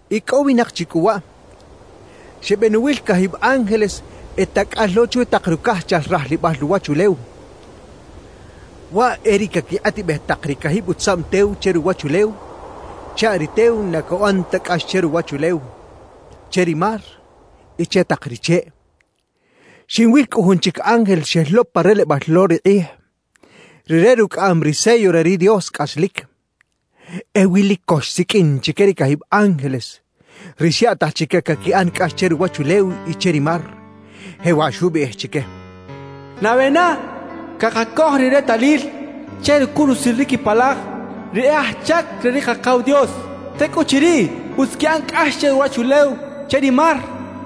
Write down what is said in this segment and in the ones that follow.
Icꞌowinak chi cꞌu waꞌ, xebenuwil cajib ángeles e tacꞌal lo chwi tak rucajchal rajlibal ruwachulew. Waꞌ e ri quequikꞌatibej tak ri cajib utzaꞌm tew che ruwachulew chaꞌ ri tew na cuꞌan ta cꞌax che ruwachulew, che ri mar y che tak ri cheꞌ. Xinwil cꞌu jun chic ángel xel lo pa relebal lo ri kꞌij; rire rucꞌaꞌam ri sello re ri Dios cꞌaslic. Ewi lic co xsiqꞌuin chique ri cajib ángeles, ri xyaꞌtaj chique caquiꞌan cꞌax che ruwachulew y che ri mar. Jewaꞌ xubiꞌij chique: «Nabe na cakacoj ri retalil che rucurusil ri quipalaj ri e aj chac re ri Kakaw Dios, tecꞌuchiriꞌ utz quiꞌan cꞌax che ruwachulew, che ri mar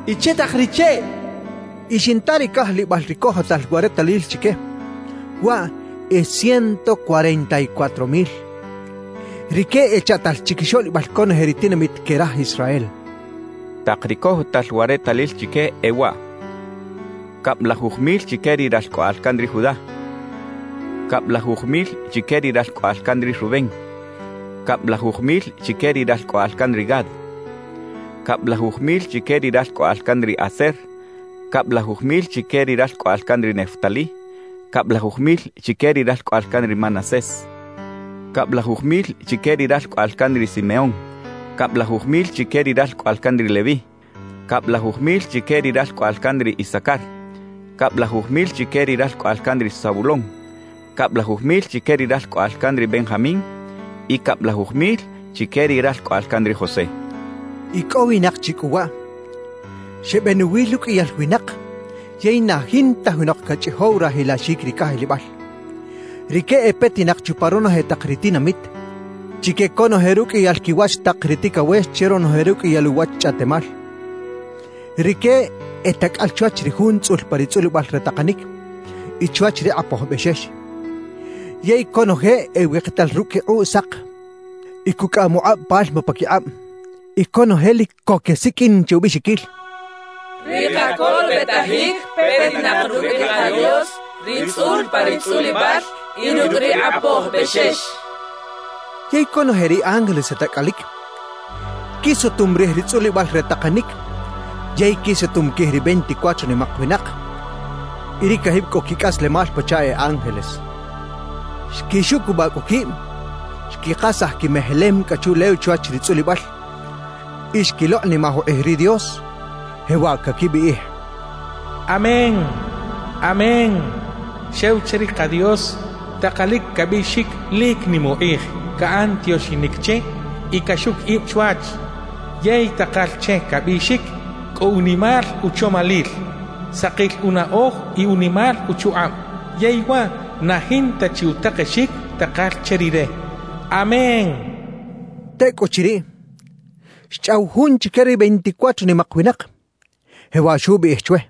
y che tak ri cheꞌ» xchaꞌ. Y xinta ri cajlibal ri cojotal wa retalil chique: waꞌ e ciento cuarenta y cuatro mil. Rique echaꞌtal chiquixoꞌlibal conoje ri tinamit que raj Israel. Tak ri cojotal wa retalil chique, e waꞌ: cablajuj mil chique ri ralcꞌoꞌal can ri Judá, cablajuj mil chique ri ralcꞌoꞌal can ri Rubén, cablajuj mil chique ri ralcꞌoꞌal can ri Gad, cablajuj mil chique ri ralcꞌoꞌal can ri Aser, cablajuj mil chique ri ralcꞌoꞌal can ri Neftalí, cablajuj mil chique ri ralcꞌoꞌal can ri Manasés, cablajuj mil chique ri ralcꞌoꞌal can ri Simeón, cablajuj mil chique ri ralcꞌoꞌal can ri Leví, cablajuj mil chique ri ralcꞌoꞌal can ri Isacar, cablajuj mil chique ri ralcꞌoꞌal can ri Zabulón, cablajuj mil chique ri ralcꞌoꞌal can ri Benjamín, y cablajuj mil chique ri ralcꞌoꞌal can ri José. Icꞌowinak chi cꞌu waꞌ, xebenuwil uqꞌuiyal winak yey na jinta junok cachꞌijow rajilaxic ri cajlibal. Rique e petinak chupa ronoje tak ri tinamit, chique conoje ruqꞌuiyal quiwach tak ri ticawex che ronoje ruqꞌuiyal uwach chꞌaꞌtemal. Rique e tacꞌal chwach ri Jun tzꞌul pa ri tzꞌulibal re takanic y chwach ri Kꞌapoj Bexex. Yey conoje e wikital rucꞌ quikꞌuꞌ sak y cucꞌaꞌam ukꞌab palma paquikꞌab. Y conoje lic co quesiqꞌuin che ubiꞌxiquil: «Ri kacolobetajic petinak rucꞌ ri ka Dios ri tzꞌul pa ri tzꞌulibal, y rucꞌ ri Kꞌapoj Bexex» quechaꞌ. Yey conoje ri ángeles e tacꞌalic, quisutum rij ri tzꞌulibal re takanic yey quisutum quij ri veinticuatro nimak winak y ri cajib cꞌo quicꞌaslemal pachaꞌ e ángeles. Xquixucubaꞌ cꞌu quib, xquikasaj quimejelem cꞌa chuꞌlew chwach ri tzꞌulibal y xquilokꞌnimaj ukꞌij ri Dios. Jewaꞌ caquibiꞌij: «¡Amén! ¡Amén! Xew che ri ka Dios takalic cabiꞌxic lic nim ukꞌij, caꞌan tioxinic che y caxuc ib chwach yey takal che cabiꞌxic cꞌo unimal uchomalil, sakil unaꞌoj y unimal uchukꞌab. Yey waꞌ na jinta chi utakexic takal che Rire. ¡Amén!» quechaꞌ. Tecꞌuchiriꞌ, xchꞌaw jun chique ri veinticuatro nimak winak, jewaꞌ xubiꞌij chwe: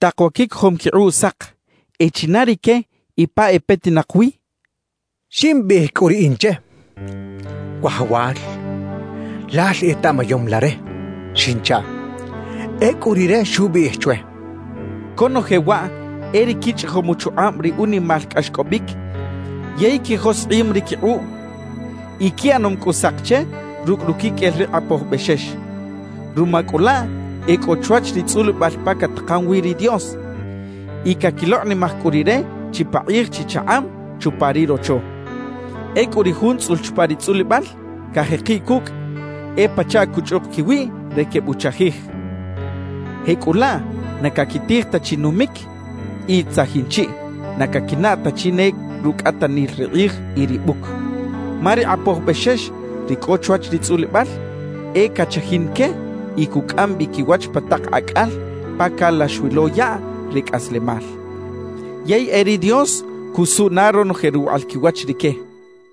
—Tak wa quicojom quikꞌuꞌ sak, ¿e china rique y pa e petinak wi? —xchaꞌ. Ximbiꞌij cꞌu riꞌin che: —Wajawal, lal etaꞌmayom la re —xinchaꞌ. Ecꞌu rire xubiꞌij chwe: —Conoje waꞌ e ri quichꞌijom uchukꞌab ri unimal cꞌaxcꞌobic yey quijoskꞌim ri quikꞌuꞌ y quiꞌanom cꞌu sak che rucꞌ ruquiqꞌuel ri Kꞌapoj Bexex. Ruma cꞌu laꞌ e cꞌo chwach ri tzꞌulibal pa catakan wi ri Dios y caquilokꞌnimaj cꞌu Rire chipakꞌij chichakꞌab chupa ri Rocho. Ecꞌu ri Jun tzꞌul chupa ri tzꞌulibal cajekiꞌ cucꞌ, e pachaꞌ cuchꞌuk quiwiꞌ re quebuchajij. Jecꞌulaꞌ na caquitij ta chi numic y tzajin chiꞌ, na caquinaꞌ ta chi ne rucꞌatanil ri kꞌij y ri buc; ma ri Kꞌapoj Bexex ri cꞌo chwach ri tzꞌulibal, e cachajin que y cucꞌam bi quiwach pa tak acꞌal pa calax wi lo yaꞌ re cꞌaslemal. Yey e ri Dios cusuꞌ na ronoje ruwaꞌal quiwach rique —xchaꞌ.